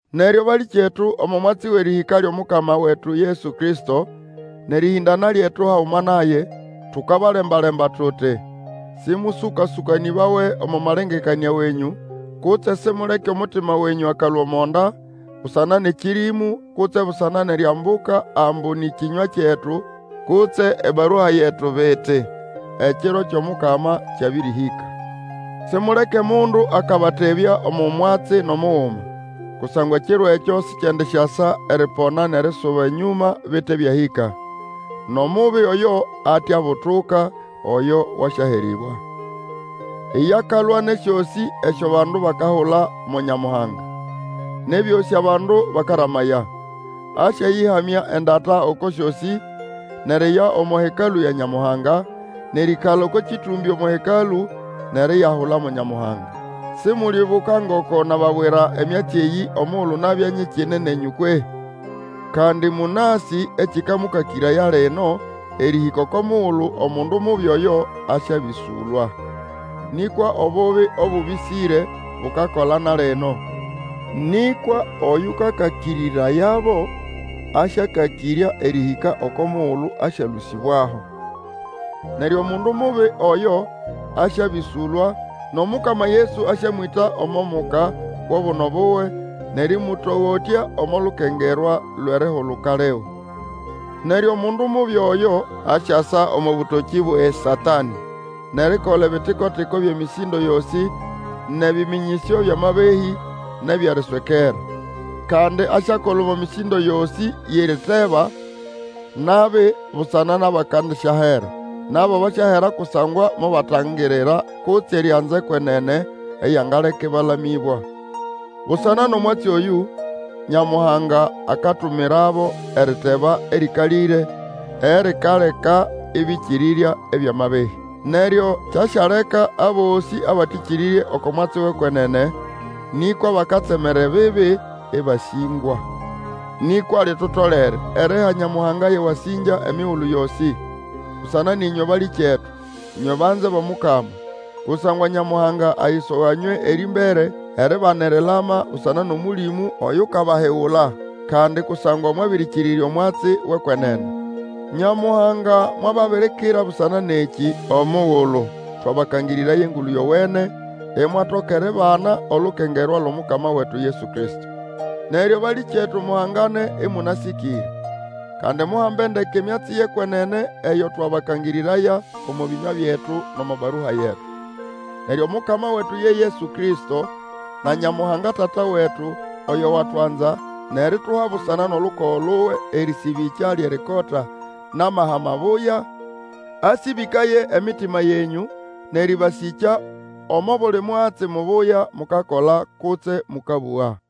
Neryo balĩkyetu, omo mwatsi wʼerĩhĩka lyʼomukama wetu Yesu Kristo, nʼerĩhĩndana lyetu haguma naye, tukabalemba-lemba tuti, Sĩmũsũkasũkanĩbawe omo malengekanĩa wenyũ, kutse simuleke omutima wenyũ akalũa omo nda, busana nʼekĩrĩmũ, kutse busana nʼeriambuka ambu nĩ kĩnywa kyetu, kutse ebarua yetu biti, Ekiro kyʼomukama kyabĩrĩhĩka. Simuleke mundu akabatebya omo mwatsi nʼomuguma. Kusangwa Ekiro ekyo sikyendisyasa eripona nʼerisuba enyũma bite byahĩka, nʼomubi Oyo ate abutuka, oyo wasyaherĩbwa. Iye akalwa nʼesyosĩ esyo abandu bakahula mo nyamuhanga, nʼebyosĩ abandu bakaramaya. Asyayĩhamya endata oko syosĩ, nʼeriya omo Hekalũ ya Nyamuhanga, nʼerĩĩkala oko kĩtũmbĩ omo Hekalũ, nʼeriyahula mo Nyamuhanga. Simulyibuka ngoko nababwira emyatsi eyĩ omugulu nabya nyikine nenyũ kwehĩ? Kandi mũnasĩ ekĩkamũkakĩraya lino, erĩhĩka oko mugulu Omundu Mubi oyo asyabĩsũlwa. Nĩkwa Obubi obũbĩsĩre bukakola na lino, nĩkwa oyũkakakĩrĩrayabo asyakakĩrya erĩhĩka oko mugulu asyalũsĩbwaho. Neryo Omundu Mubi oyo asyabĩsũlwa, nʼOmukama Yesu asyamwĩta omo muka wʼobuno buwe, nʼerĩmũtogotya omo lukengerwa lwʼerihuluka liwe. Neryo Omundu Mubi oyo asyasa omo bũtokĩ bwʼeSatanĩ nʼerikola ebitiko-tiko byʼemĩsĩndo yosĩ nʼebĩmĩnyĩsyo byʼamabehĩ, nʼebyʼeriswekera. Kandi asyakola omo mĩsĩndo yosĩ yʼeriteba nabi busana nʼabakandisyahera. Nabo basyahera kusangwa mobatangirira kutse erianza ekwenene, eyangaleka ĩbalamĩbwa. Busana nʼomwatsi oyũ, Nyamuhanga akatumirabo eriteba erĩkalĩre, erikaleka ĩbĩkĩrĩrya ebyʼamabehĩ. Neryo kyasyaleka abosĩ abatĩkĩrĩrye oko mwatsi wʼekwenene, nĩkwa bakatsemera ebibi, ĩbasĩngwa. Nĩkwa litutolere eriha Nyamuhanga yʼewasĩngya emigulu yosĩ, busana nʼĩnywe balĩkyetu, ĩnywe banze bʼOmukama. Kusangwa Nyamuhanga ayisoga nywe erĩmbere eribana erilama busana nʼOmũlĩmũ oyukabahigula, kandi kusangwa mwabĩrĩkĩrĩrya omwatsi wʼekwenene. Nyamuhanga mwababirikira busana nʼekĩ omugulu twabakangĩrĩraya Engulu Yowene, imwatoka eribana olukengerwa lwʼOmukama wetu Yesu Kristo. Neryo balĩkyetu, muhangane ĩmũnasĩkĩre, kandi muhambe ndeke emyatsi yʼekwenene eyo twabakangĩrĩraya, omo bĩnywa byetu nʼomo barua yetu. Neryo Omukama wetu ye Yesu Kristo, na Nyamuhanga Tata wetu, oyo watwanza, nʼerituha busana nʼolukogo luwe erĩsĩbĩkya lyʼerikota nʼamaha mabuya, asĩbĩkaye emitima yenyũ, nʼerĩbasĩkya omo buli mwatsi mubuya mukakola kutse mũkabũga.